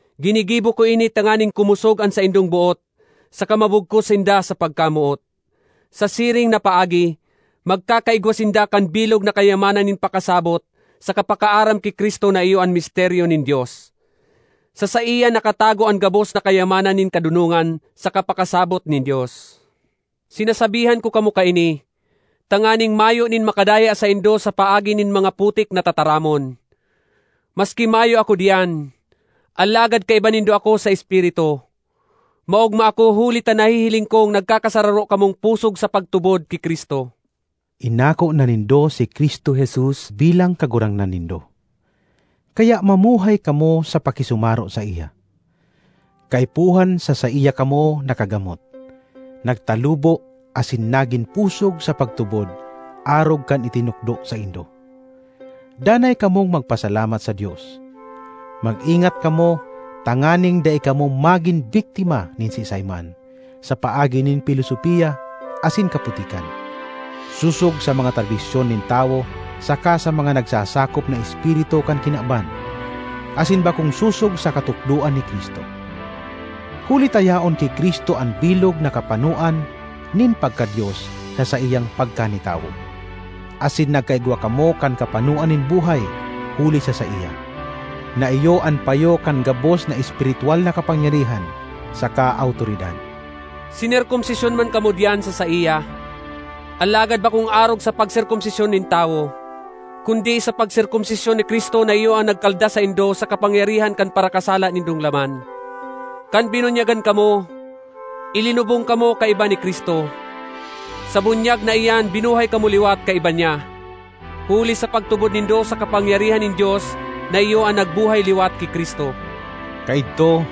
Ginigibo ko ini tanganing kumosog an saindang boot saka mabugkos sinda sa pagkamoot. Sa siring na paagi magkakaigwa sinda kan bilog na kayaman (kayamanan or yaman) nin pakasabot saka pakaaram ki Cristo na iyo an misteryo nin Dios. Sa saiya nakatago an gabos na kayamanan nin kadonongan saka pakasabot nin Dios. Sinasabihan ko kamo kaini tanganing mayo nin makadaya saindo sa paagi nin mga putik na tataramon. Maski mayo ako diyan, alagad kaiba nindo ako sa espiritu; maogma ako huli ta nahihiling kong nagkakasararo kamong pusog sa pagtubod ki Cristo. Inako na nindo si Cristo Jesus bilang Kagurangnan nindo, kaya mamuhay kamo sa pakisumaro saiya. Kaipuhan sa saiya kamo nakagamot, nagtalubo asin nagin pusog sa pagtubod arog kan itinukdo saindo. Danay kamong magpasalamat sa Dios. Mag-ingat kamo tanganing dai kamo magin biktima nin siisay man sa paagi nin pilosopia asin kaputikan, sosog sa mga tradisyon nin tawo saka sa mga nagsasakop na espiritu kan kinaban, asin bakong sosog sa katukdoan ni Cristo. Huli ta yaon ki Cristo an bilog na kapanoan nin pagka-Dios sa saiyang pagkanitawo, asin nagkaigwa kamo kan kapanoan nin buhay huli sa saiya, na iyo an payo kan gabos na espiritwal na kapangyarihan saka awtoridad. Sinerkomsisyon man kamo diyan sa saiya, alagad bakong arog sa pagserkomsisyon nin tawo, kundi sa pagserkomsisyon ni Cristo na iyo an nagkalda saindo sa kapangyarihan kan parakasala nindong laman. Kan binunyagan kamo, ilinubong kamo kaiba ni Cristo; sa bunyag na iyan binuhay kamo liwat kaiba niya, huli sa pagtubod nindo sa kapangyarihan nin Dios na iyo an nagbuhay liwat ki Cristo. Kaidto,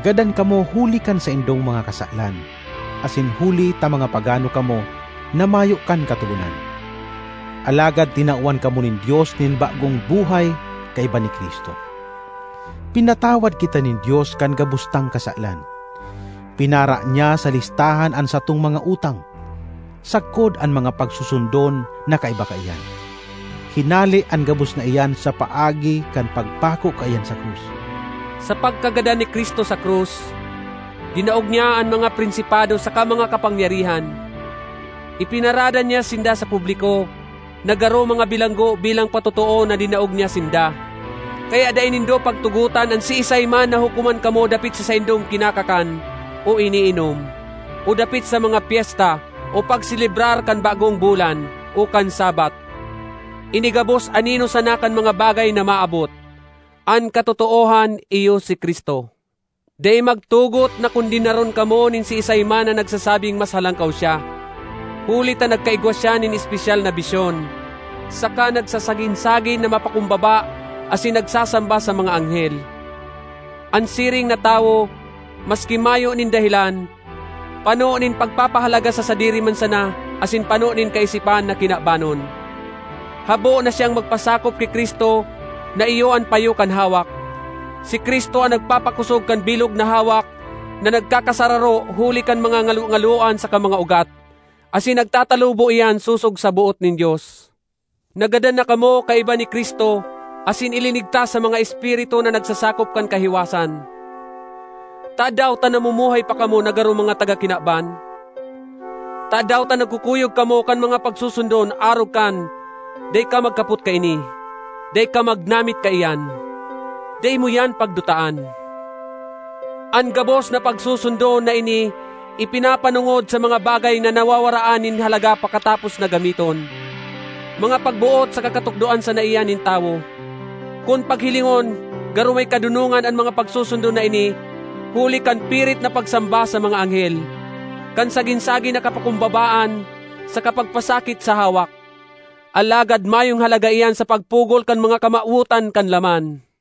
gadan kamo huli kan saindong mga kasalan asin huli ta mga pagano kamo na mayo kan Katogonan. Alagad tinawan kamo nin Dios nin bagong buhay kaiba ni Cristo! Pinatawad kita nin Dios kan gabos tang kasalan. Pinara niya sa listahan an satong mga utang, sagkod an mga pagsusundon na kaiba kaiyan; hinale an gabos na iyan sa paagi kan pagpako kaiyan sa krus. Sa pagkagadan ni Cristo sa krus, dinaog niya an mga prinsipado saka mga kapangyarihan. Ipinarada niya sinda sa publiko na garo mga bilanggo bilang patotoo na dinaog niya sinda. Kaya dai nindo pagtugotan an siisay man na hukoman kamo dapit sa saindong kinakakan o iniinom, o dapit sa mga pyesta, o pagselebrar kan bagong bulan, o kan Sabbath. Ini gabos anino sana kan mga bagay na maabot; an katotoohan iyo si Cristo. Dai magtugot na kondenaron kamo nin siisay man na nagsasabing mas halangkaw siya, huli ta nagkaigwa siya nin espesyal na bisyon, saka nagsasagin-sagin na mapakumbaba asin nagsasamba sa mga anghel. An siring na tawo, maski mayo nin dahelan, pano nin pagpapahalaga sa sadiri man sana asin pano nin kaisipan na kinabanon. Habo na siyang magpasakop ki Cristo na iyo an payo kan hawak. Si Cristo an nagpapakosog kan bilog na hawak na nagkakasararo huli kan mga ngalongaloan saka mga ugat; asin nagtatalubo iyan sosog sa boot nin Dios. Nagadan na kamo kaiba ni Cristo asin ilinigtas sa mga espiritu na nagsasakop kan kahiwasan. Tadaw ta namumuhay pa kamo na garo mga taga kinaban? Tadaw ta nagkukuyog kamo kan mga pagsusundon arog kan, ”Dai ka magkapot kaini,” “Dai ka magnamit kaiyan,” “Dai mo iyan pagdutaan”? An gabos na pagsusundon na ini ipinapanongod sa mga bagay na nawawaraan nin halaga pakatapos na gamiton. Mga pagboot saka katukdoan sana iyan nin tawo. Kun paghilingon garo may kadonongan an mga pagsusundon na ini huli kan pirit na pagsamba sa mga anghel, kan sagin-sagin na kapakumbabaan saka pagpasakit sa hawak; alagad mayong halaga iyan sa pagpugol kan mga kamawotan kan laman.